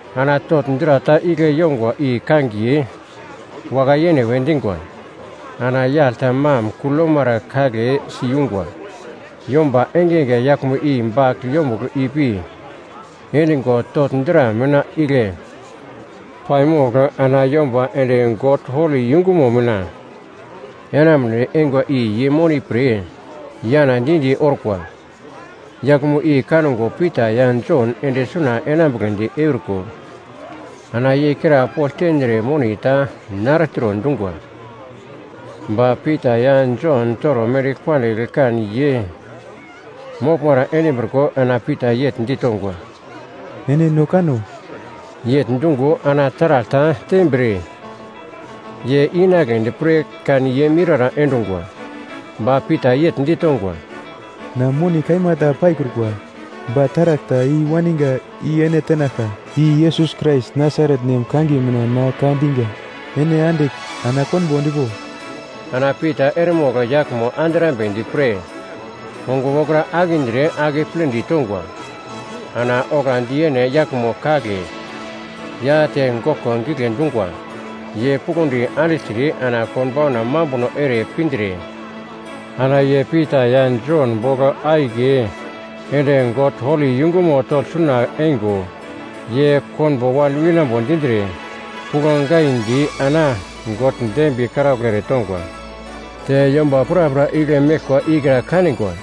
Ana togl dra ta igle yongwa i kangiye ‘Wakai-yene’ we dingwa. Ana yagl ta mam kugl yomara kagle siyungwa, yomba engenge yaglmo i bagl yombugl ipi endingo togl dra mina igle paimogl ana yomba ende God holi yungumo mina enamunedi eingwa i ye moni pre yana di-di orkwa. Yaglmo i kango Pita ya Jon ende suna enambugledi euriko, ana ye krapogl tendre moni ta nartro dungwa. Ba Pita ya Jon toro mendigl pandigl kan ye moglmara endimbriko ana Pita yegl ditongwa, “Ene no kano!” Yegl dungo ana taragl ta tembir ye inagledi pre kan ye miurara endungwa. Ba Pita yegl ditongwa, “Na moni kaima ta paikrukwa, ba taragl ta i-waninga i ene tenaglka; i Yesus Krais Nasaret nem kangiye mina na ka dinga, ene andigl ana konbo endpo!” Ana Pita eremogl yaglmo andrambedi pre ongo wokra akindre akepledi tongwa. Ana oglandi yene yaglmo kagle ya te goglko gigle dungwa. Ye puglondi andigltre ana konbauna mambuno ere pindre, ana ye Pita ya Jon bogl akiye ende God holi yungumo togl suna eingo ye konbo wan winambo dindre, puglo giandi ana God dembiye karaugl eretongwa. Te yomba prapra igle meglkwa ikra kanigwa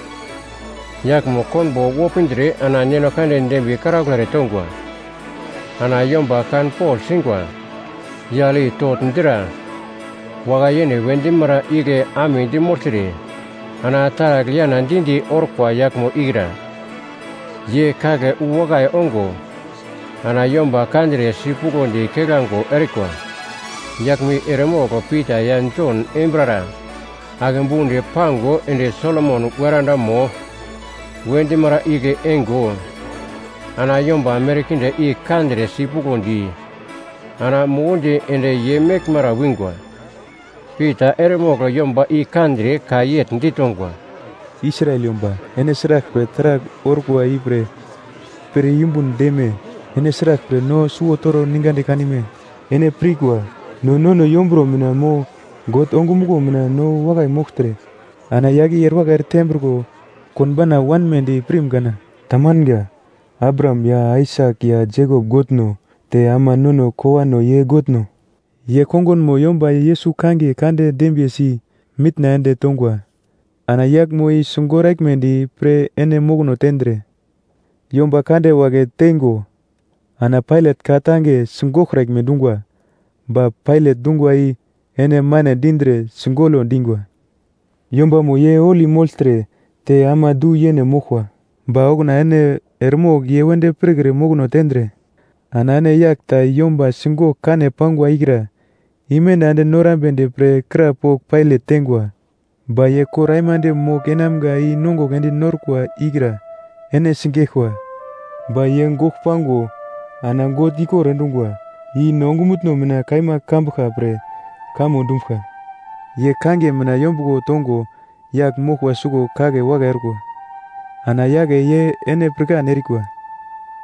yaglmo konbo wopindre ana God dembiye karaugl eretongwa, ana yomba kanpogl singwa yagl i togl dra “Wakai-yene” we dimara igle amedi mogltre ana taragl yana di-di orkwa yaglmo ikra, ye kagle wu wakai ongo ana yomba kandre sipuglodi keglango erikwa. Yaglmo i eremogl Pita ya Jon embirara ake budi pango ende Solomon weradamo we dimara igle eingo, ana yomba merkinde i kandre sipuglodi ana mukundi ende ye meglmara wingwa. Pita eremogl yomba i kandre ka yegl ditongwa, “Israel yomba, ene sraglpre taragl orkwa ipre pir yumbun deme? Ene sraglpre no suwo toro ningadi kanime? Ene pirkwa no nono yomburo mina mo God ongumuglo mina no wakai mogltre ana yagl i erewakai eretembriko konbauna wanmedi pirim kana? Tamanga. Abraham ya Aisak ya Jekop Godno, te ama nono kowano ye Godno, ye kongunmo yomba Yesus kangiye kande dembiyesi mitna ende tongwa. Ana yaglmo i sigoraglmedi pre ene mokono tendre yomba kande wagle teingo, ana Pailat ka-tange sigoglkraglme dungwa. Ba Pailat dungwa i ene mane dindre sigolo dingwa. Yombamo ye Holi mogltre te ama du-yene moglkwa, ba okuna ene eremogl ye wedi pirkre mokono tendre ana ene yagl ta yomba sigogl kane pangwa ikra imenda ende norambedi pre krapogl Pailat teingwa. Ba ye kor aimande mogl enamga i-nongugl ende norkwa ikra ene sigeglkwa. Ba ye gogl pango ana God ikor endungwa, i no ongumutno mina kaima kambuglka pre kamo dumbuglka. Ye kangiye mina yombuglo tongo yagl moglkwa suglo kagle wakai orkwa. Ana yagle ye ene pirkan erikwa,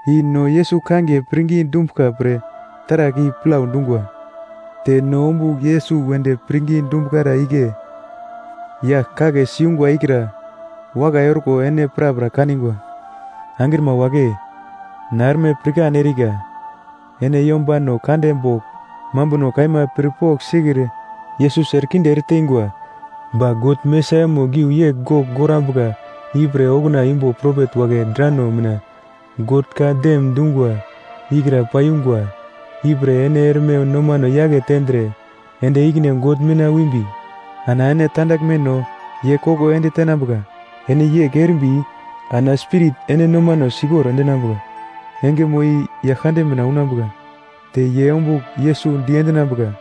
i no Yesus kangiye pirngi dumbuglka pre taragl i plau dungwa, te no ombugl Yesus wedi pirngi dumbuglara igle yagl kagle siyungwa ikra wakai orko ene prapra kanigwa. “Angrima wagle, na erme pirkan erika, ene yombano kande bogl mambuno kaima pir pogl sikre Yesus erekinde ereteingwa. Ba God Mesaiamo giu yegl gogl gorambuka ipre okuna imbo propet wagle drano mina God ka-dem dungwa ikra paiyungwa. Ipre ene erme nomano yake tendre ende ikine God mina wimbi, ana ene tandaglmeno ye koko ende tenambuka. Ene yegl erimbi ana Spirit ene nomano sikor endinambuka engemo i Yaglkande mina unambuka, te ye ombugl Yesus diendinambuka,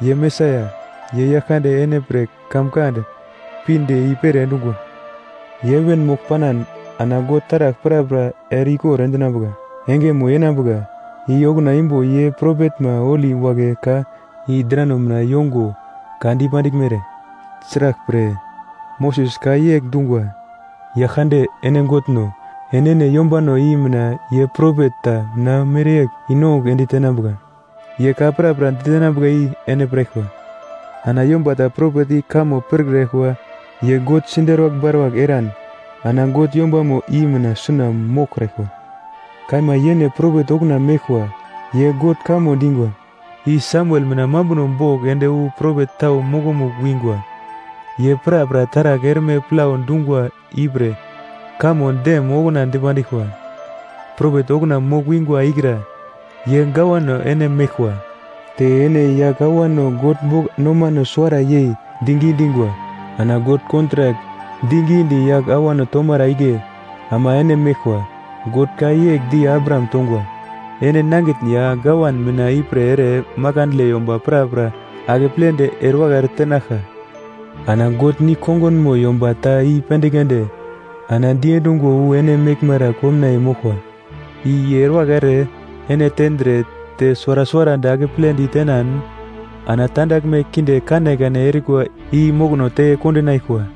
ye Mesaia, i Yaglkande ene pre kamkand pinde i-pere endungwa. Ye heven mogl panan ana God taragl prapra ere-ikor endinambuka engemo yenambuka, i okuna imbo ye propetma holi wagle ka i drano mina yongo ka dipandiglmere. Sraglpre, Moses ka yegl dungwa, ‘Yaglkande ene Godno, enene yombano i mina ye propet ta na mereyegl i-nongugl ende tenambuka. Ye ka prapra ditenambuka i ene piraglkwa. Ana yomba ta propet i kamo pirkraglkwa ye God siderwagl baruwagl eran ana God yombamo i mina suna moglkraglkwa.’ “Kaima yene propet okuna meglkwa ye God kamo dingwa, i Samuel mina mambuno bogl ende wu propet tau mokomugl wingwa, ye prapra taragl erme plau dungwa ipre kamo dem okuna dipandiglkwa. Propet okuna mogl-wingwa ikra ye gawano ene meglkwa, te ene yagl awano God bogl nomano suwara yei digi dingwa. Ana God kontrak digidi yagl awano tomara igle ama ene meglkwa. God ka yegl di Abraham tongwa, ‘Ene nangitn ya gawan mina ipre ere makandle yomba prapra akepledi erewakai eretenaglka.’ Ana God nigl-kongunmo yomba ta i-pendigl ende ana diendungo wu ene meglmara komnaiye moglkwa, i ye erewakai ere ene tendre te suwara suwarandi akeple ditenan ana tandaglme kinde kanekane erikwa i mokono te kondinaglkwa.”